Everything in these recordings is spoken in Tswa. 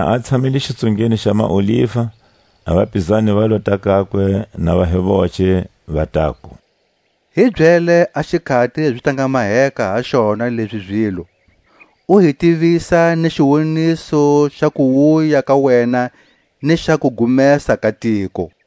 Na a tshamile xitsungeni xa maoliva, a vapizani va lota kakwe na va hi voce, va taku: Hi byele a xikhati zi ta nga maheka ha xona lezi zilo, u hi tivisa ni xiwoniso xa kuwuya ka wena ni xa kugumesa ka tiko.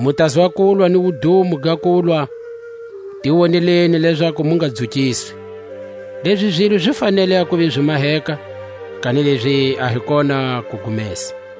Mu tazwa kulwa ni wudumo ga kulwa; ti woneleni lezaku mu nga dzukiswi. Lezi zilo zi fanele a kuva zi maheka, kanilezi a hi kona kugumesa.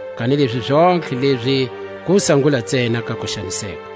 Kanilezi zontlhe lezi kusangula ntsena ka kuxaniseka.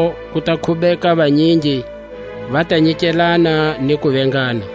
Kwalaho ku ta khubeka vanyingi; va ta nyiketana ni ku vengana.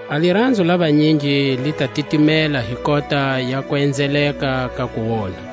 A liranzo la vanyingi li ta titimela hi kota ya kuenzeleka ka kuonha.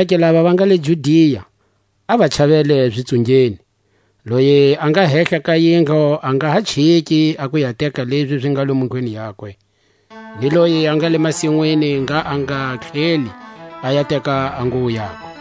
zonake lava va nga le Judia a va chavele zitsungeni; loye a nga hehla ka yindlu a nga ha chiki a ku ya teka lezi zi nga lomu ndlwini yakwe; ni loye a nga le masinwini ngha a nga tlheli a ya teka a nguwo yakwe,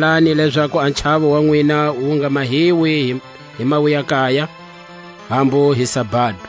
Khongelani lezaku a chawo wa nwina wu nga mahiwi hi mawuyakaya, hambu hi sabado;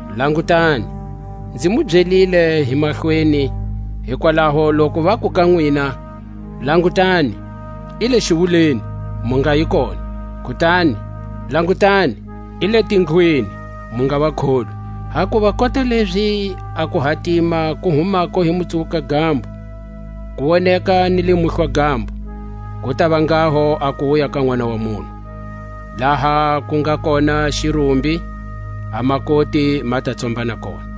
Langutani, nzi mu byelile hi mahlweni. Hikwalaho loku vaku ka nwina: Langutani, i le xiwuleni, mu ngayi kona; kutani, Langutani, i le tindlwini, mu nga va kholwi. Hakuva kota lezi a kuhatima ku humako hi Mutsuwuka-gambo, ku woneka ni le Muhlwa-gambo, ku tava nghaho a kuwuya ka Nʼwana wa munhu. Laha ku nga kona xirumbi, a makoti ma ta tsombana kona.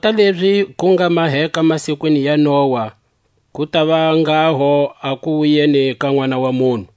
Kota lezi ku nga maheka masikwini ya Noa, ku tava nghaho a kuwuyeni ka Nʼwana wa munhu.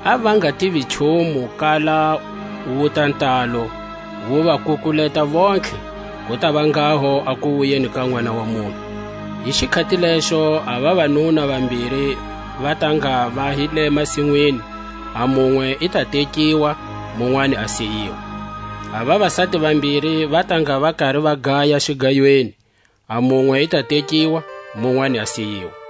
a va nga tivi nchumu kala wuta ntalo, wu va kukuleta vontlhe; ku tava nghaho a kuwuyeni ka Nʼwana wa munhu. Hi xikhati lexo a vavanuna vambiri va ta ngha va hi le masinwini, a munwe i ta tekiwa, munwani a siyiwa; a vavasati vambiri va ta ngha va kari va gaya xigayweni, a munwe i ta tekiwa, munwani a siyiwa.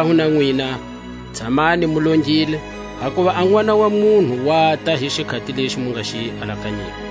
Hikwalaho na nwina, tshamani mu longile, hakuva a Nʼwana wa munhu wata hi xikhati lexi mu nga xi alakanyiko.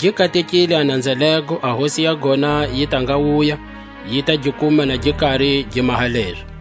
Gi katekile a nanza lego a hosi ya gona yi ta nga wuya, yi ta gi kuma na gi kari gi maha lezo.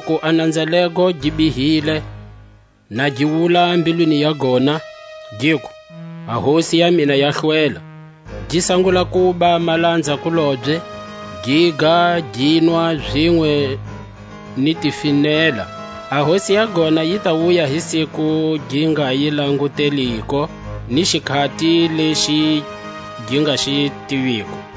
Kanilezi loku a nanza lego gi bihile, na gi wula mbilwini ya gona, giku:. A hosi ya mina ya hlwela; gi sangula kuba malanza-kulobye, giga ni kunwa zinwe ni tifinela; a hosi ya gona yi ta wuya hi siku gi nga yi languteliko, ni xikhati lexi gi nga xi tiviko,